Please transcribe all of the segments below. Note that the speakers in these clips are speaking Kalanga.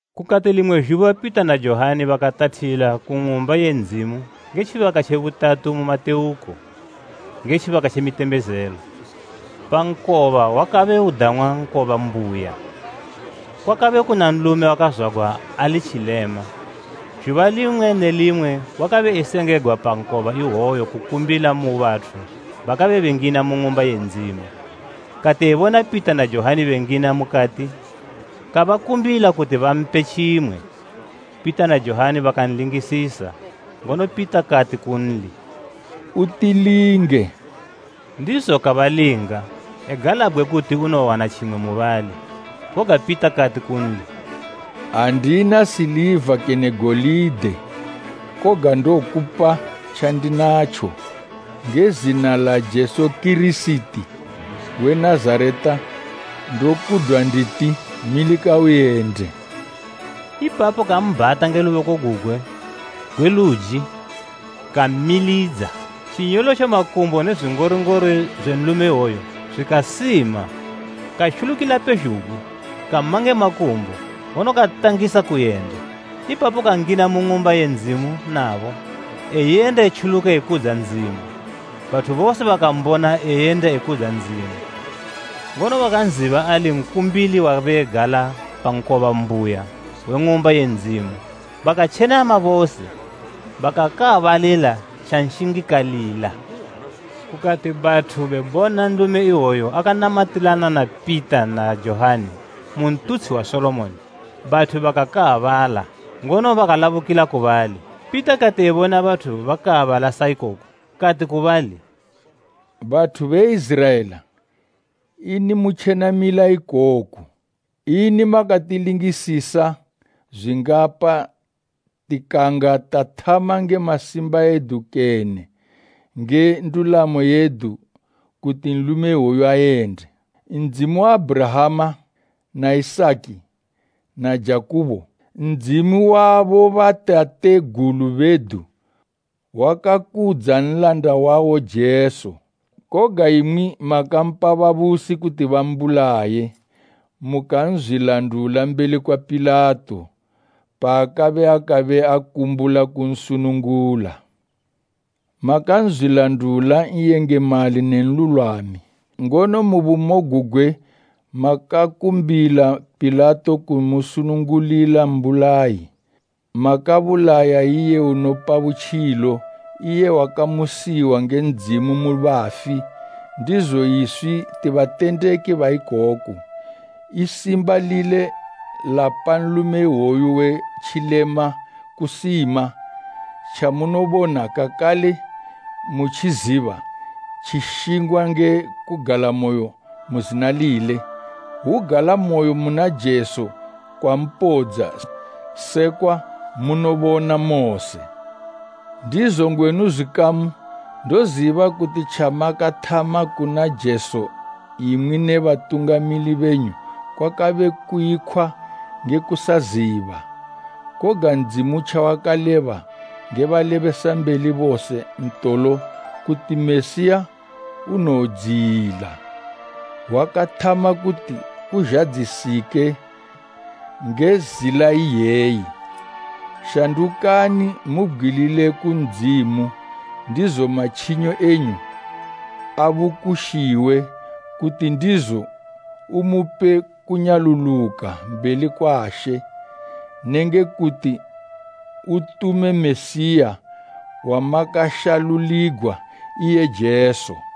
Kukati limwe zhuba Pita na Johani bakatathila ku Ng'umba ye Ndzimu nge tjibaka tje butatu mu matewuko, nge tjibaka tje mitembezelo. Pa nkoba wakabe udang'wa Nkoba Mbuya, kwakabe kuna nlume wakazwagwa ali tjilema. Zhuba limwe ne limwe wakabe esengegwa pa nkoba iwoyo kukumbila mu bathu bakabe bengina mu Ng'umba ye Ndzimu. Kati ebona Pita na Johani bengina mukati, kabakumbila kuti bampe tjimwe. Pita na Johani bakanlingisisa, ngono Pita kati kunli, “Utilinge!” Ndizo kabalinga, egalabgwe kuti unowowana tjimwe mubali. Koga Pita kati kunli, “Andina siliva kene golide, koga ndokupa tjandinatjo: Nge zina la Jesu Kirisiti we Nazareta ndokudwa nditi, milika uyende.” Ipapo kambhata nge luboko gugwe gwe luji kammilidza. Tjinyolotjo makumbo ne zwingoringori zwe nlume iwoyo zwikasima. Katjulukila pezhugwi, kama nge makumbo, ngono katangisa kuyenda. Ipapo kangina mu Ng'umba ye Ndzimu nabo, eyenda etjuluka ekudza Ndzimu. Bathu bose bakambona eyenda ekudza Ndzimu, ngono bakanziba ali nkumbili wabe egala pa Nkoba Mbuya we Ng'umba ye Ndzimu, bakatjenama bose bakakaabalila tjanshingikalila. Kukati bathu bebona nlume iwoyu akanamatilana na Pita na Johani mu Ntutshi wa Solomoni, bathu bakakaabala, ngono bakalabukila ku bali. Pita kati ebona bathu bakaabala saikoku, kati ku bali, “Bathu be Iziraela, ini mutjenamila ikoku? Ini makatilingisisa zwingapa tikanga tathama nge masimba edu kene nge ndulamo yedu kuti nlume iwoyu ayende? Ndzimu wa Abhurahama, na Isaki na Jakubo, Ndzimu wa bobatategulu bedu wakakudza Nlanda wawo Jesu. Koga imwi makampa babusi kuti bambulaye, mukanzwilandula mbeli kwa Pilato, paakabe akabe akumbula kunsunungula. Makanzwilandula N'yengemali ne nlulwami, ngono mu bumo gugwe makakumbila Pilato kumusunungulila mbulayi. Makabulaya iye unopa butjilo, iye wakamusiwa nge Ndzimu mu bafi, ndizo iswi ti batendeki ba ikoku. I simba lile lapa nlume iwoyu we tjilema kusima. Tjamunobona kakale mutjiziba tjishingwa nge kugalamoyo mu zina lile; hwugalamoyo muna Jesu kwampodza, sekwa munobona mose. “Ndizo ngwenu zwikamu, ndoziba kuti tjamakathama kuna Jesu imwi ne batungamili benyu kwakabe kuyikhwa nge kusaziba. Koga Ndzimu tjawakaleba nge balebesambeli bose ntolo kuti Mesiya unowodziyila, wakathama kuti kuzhadzisike nge zila iyeyi. Shandukani mubgwilile ku Ndzimu, ndizo matjinyo enyu abukushiwe, kuti ndizo umupe kunyaluluka mbeli kwa She, nenge kuti utume Mesiya wamakashaluligwa, iye Jesu.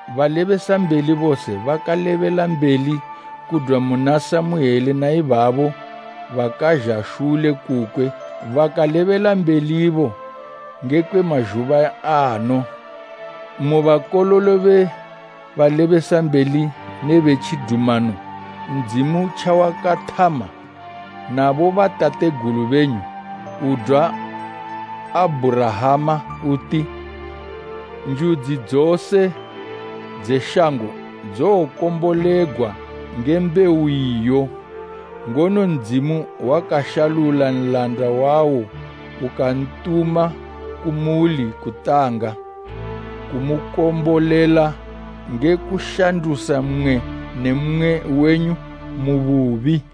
Balebesambeli bose bakalebelambeli kudwa muna Samuele na ibabo bakazha shule kukwe bakalebelambelibo ngekwe mazhuba ano. Mu bakololo be balebesambeli nebe tjidumano Ndzimu tjawakathama na bobatategulu benyu, udwa Abhurahama uti, ‘Njudzi dzose dze shango dzowokombolegwa nge mbewu iyo.’ Ngono Ndzimu wakashalula Nlanda wawo ukantuma kumuli kutanga, kumukombolela nge kushandusa mmwe ne mmwe wenyu mu bubi.”